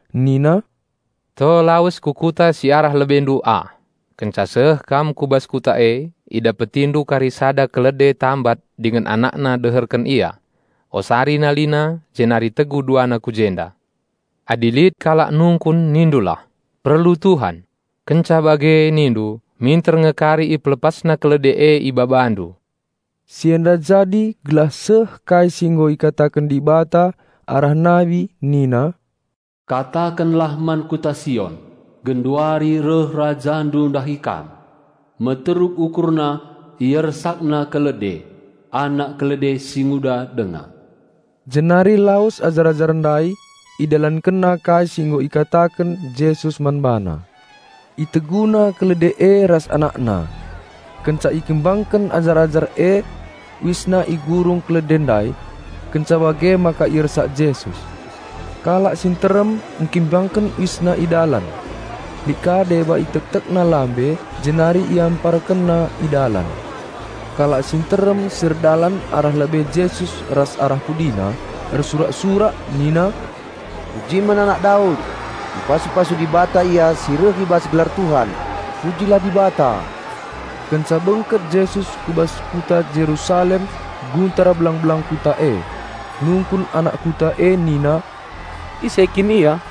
Nina, "To lawes ku kuta si arah lebendu ah; kenca seh kam ku bas kuta e, idapetindu kari sada kalde tambat dingen anakna deherken ia. Osari nalina jenari tegu duana ku jenda. Adi lit kalak nungkun nindulah, 'Perlu Tuhan'; kenca bage nindu minter nge kari ipelepasna kalde e ibabandu." Si enda jadi gelah seh kai si nggo ikataken Dibata arah nabi nina, "Katakenlah man Kota Sion, genduari reh Rajandu ndahi kam, meteruk UkurNa IersakNa kalde, anak kalde singuda denga." Jenari lawes ajar-ajar ndai, idalankenna kai si nggo ikataken Jesus man bana. Iteguna kalde e ras anakna. Kenca ikimbangken ajar-ajar e uisna i gurung kalde ndai, kenca bage maka iersak Jesus. Kalak si nterem ngkimbangken uisna i dalan. Lit ka deba itektekna lambe jenari iamparkenna i dalan. Kalak si nterem si erdalan arah lebe Jesus ras arah PudiNa ersurak-surak nina, "Pujin man Anak Daud! Ipasu-pasu Dibata Ia si reh i bas gelar Tuhan! Pujilah Dibata!" Kenca bengket Jesus ku bas Kota Jerusalem guntar belang-belang kota e. Nungkun anak kota e nina, "Ise kin Ia?"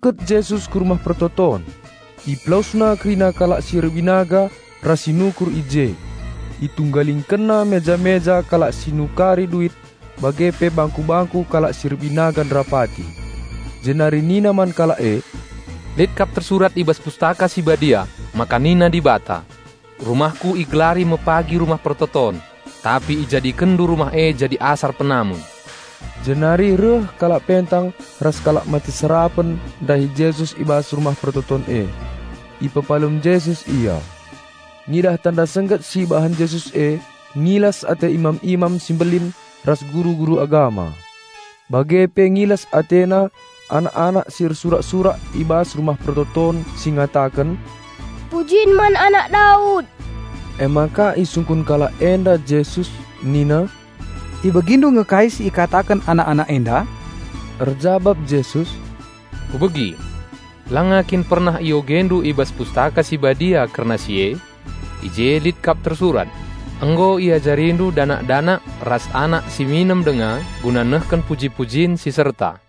Bengket Jesus ku Rumah Pertoton IpelawesNa kerina kalak si erbinaga ras si nukur i je. ItunggalingkenNa meja-meja kalak si nukari duit bage pe bangku-bangku kalak si erbinaga nderapati. Jenari nina man kalak e, "Lit kap tersurat i bas Pustaka Si Badia maka nina Dibata, 'RumahKu igelari me pagi Rumah Pertoton.' Tapi ijadikenndu Rumah e jadi asar penamun." Jenari reh kalak pentang ras kalak mate serapen ndahi Jesus i bas Rumah Pertoton e; ipepalem Jesus ia. Ngidah tanda sengget si ibahan Jesus e, ngilas ate imam-imam si mbelin ras guru-guru agama. Bage pe ngilas atena anak-anak si ersurak-surak i bas Rumah Pertoton si ngataken, "Pujin man Anak Daud!" Emaka isungkun kalak enda Jesus nina, "IbegiNdu nge kai si ikataken anak-anak enda?" Erjabap Jesus, "Kubegi! Langa kin pernah iogendu i bas Pustaka Si Badia kerna si e? I je lit kap tersurat, 'Nggo iajarindu danak-danak ras anak si minem denga guna ngendeken puji-pujin si serta.'"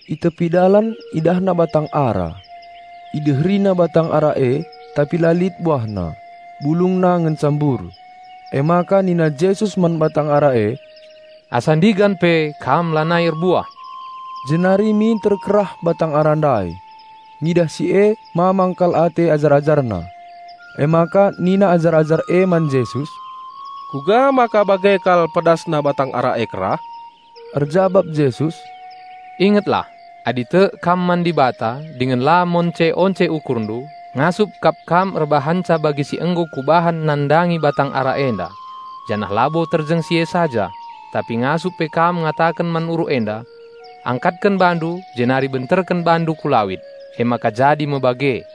I tepi dalan IdahNa batang ara. IdeheriNa batang ara e, tapi la lit buahna, bulungna ngenca mbur. Emaka nina Jesus man batang ara e, "Asa ndigan pe kam lanai erbuah!" Jenari minter kerah batang ara ndai. Ngidah si e mamang kal ate ajar-AjarNa. Emaka nina ajar-ajar e man Jesus, "Kuga maka bage kal pedasna batang ara e kerah?" Erjabap Jesus, "Ingetlah! Adi tek kam man Dibata dingen la monce-once ukurndu, ngasup kap kam erbahanca bagi si nggo Kubahan nandangi batang ara enda; janah labo si e, tapi ngasup pe kam ngataken man uruk enda, 'Angkatlah bandu jenari ambekken bandu ku lawit,' janah jadi me bage!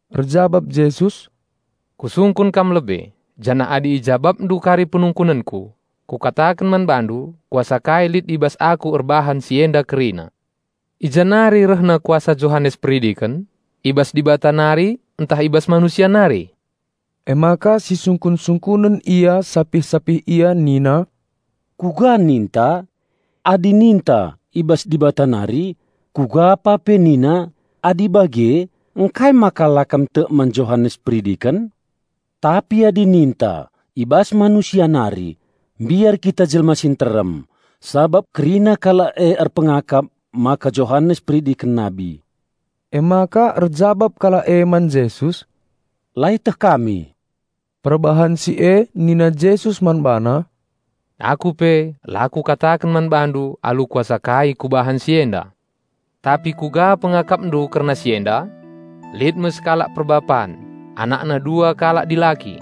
Erjabap Jesus, "Kusungkun kam lebe, janah adi ijabapndu kari penungkunenKu, Kukataken man bandu Kuasa kai lit i bas Aku erbahan si enda kerina. I ja nari rehna kuasa Johanes Peridiken, i bas Dibata nari ntah i bas manusia nari?" Emaka sisungkun-sungkunen ia sapih-sapih ia nina, "Kuga ninta? Adi ninta, 'I bas Dibata nari,' kugapa pe NiNa, 'Adi bage, ngkai maka la kam tek man Johanes Peridiken?' Tapi adi ninta, 'I bas manusia nari,' mbiar kita jelma si nterem, sabap kerina kalak e erpengakap maka Johanes Peridiken nabi." Emaka erjabap kalak e man Jesus, "La ieteh kami." Perbahan si e nina Jesus man bana, "Aku pe la Kukataken man bandu alu kuasa kai Kubahan si enda." "Tapi kuga pengakapndu kerna si enda? Lit me sekalak perbapan, anakna dua kalak dilaki.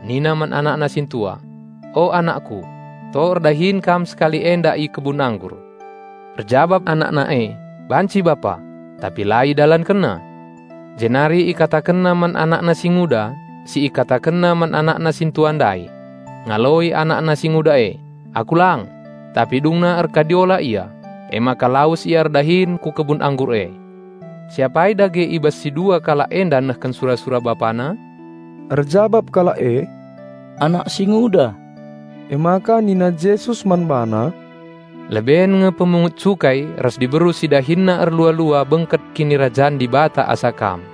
Nina man anakna sintua, 'O anakku, to erdahin kam sekali enda i kebun anggur.' Erjabap anakna e, 'Banci bapa,' tapi la idalankenna. Jenari ikatakenna man anakna singuda si ikatakenna man anakna sintua ndai. Ngaloi anakna singuda e, 'Aku lang,' tapi dungna erkadiola ia, emaka lawes ia erdahin ku kebun anggur e. Si apai dage i bas si dua kalak enda nehken sura-sura bapana?" Erjabap kalak e, "Anak singuda." Emaka nina Jesus man bana, "Leben nge pemungut cukai ras diberu si dahinna erlua-lua bengket Kinirajan Dibata asa kam.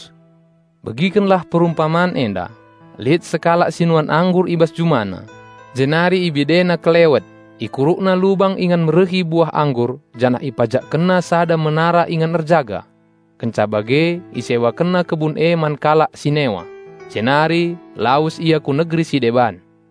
Nina Jesus, "Begiken lah perumpaman enda. Lit sekalak si nuan anggur i bas jumana Jenari ibidena kelewet. Ikurukna lubang ingan merehi buah anggur janah ipajekkenna sada menara ingan erjaga. Kenca bage isewakenna kebun e man kalak si newa, Jenari lawes ia ku negeri si deban.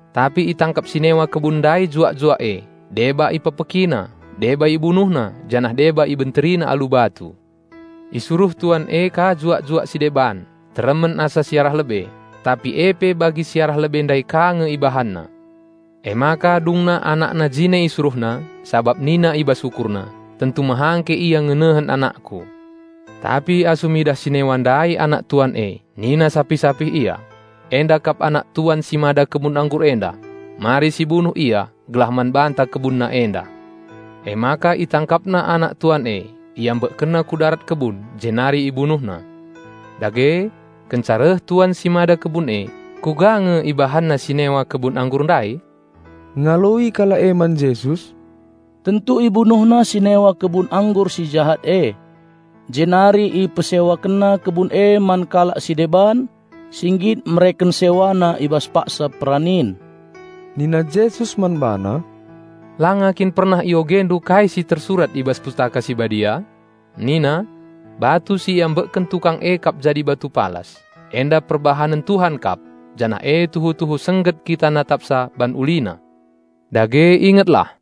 Tapi itangkap si newa kebun ndai juak-juak e, deba ipekpekina, deba ibunuhna janah deba ibenterina alu batu. Isuruh tuan e ka juak-juak si deban teremen asa si arah lebe, tapi e pe bagi si arah lebe ndai ka nge ibahanna. Emaka dungna anakna jine isuruhna, sabap nina i bas ukurna, 'Tentu mehangke ia ngenehen anakku.' Tapi asum idah si newa ndai anak tuan e nina sapih-sapih ia, 'Enda kap anak tuan si mada kebun anggur enda. Mari si bunuh ia gelah man banta kebunna enda.' Emaka itangkapna anak tuan e, iambekkenna ku darat kebun Jenari ibunuhna. Dage, kenca reh tuan si mada kebun e, kuga nge ibahanna si newa kebun anggur ndai?" Ngaloi kalak e man Jesus, "Tentu ibunuhna si newa kebun anggur si jahat e, Jenari ipesewakenna kebun e man kalak si deban si nggit mereken sewana i bas paksa peranin." Nina Jesus man bana, "Langa kin pernah iogendu kai si tersurat i bas Pustaka Si Badia? Nina, 'Batu si iambekken tukang e kap jadi batu palas. Enda kap perbahanen Tuhan; andiko ulina!'" "Dage ingetlah,"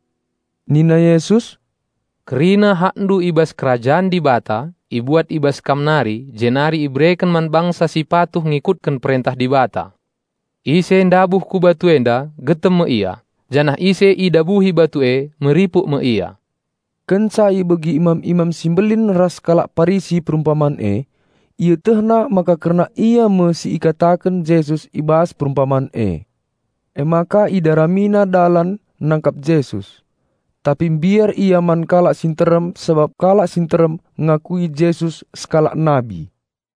nina Yesus, "kerina hakndu selaku bangsa Dibata ibuat i bas kam nari jenari ibereken man bangsa si patuh ngikutken perentah Dibata. (Ise ndabuh ku batu enda getem me ia; janah ise idabuhi batu e meripuk me ia.") Kenca ibegi imam-imam si mbelin ras kalak Parisi perumpaman e, ietehna maka kerna ia me si ikataken Jesus i bas perumpaman e. Emaka idaramina dalan nangkap Jesus. Tapi mbiar ia kalak si nterem sabap kalak si nterem ngakui Jesus sekalak nabi.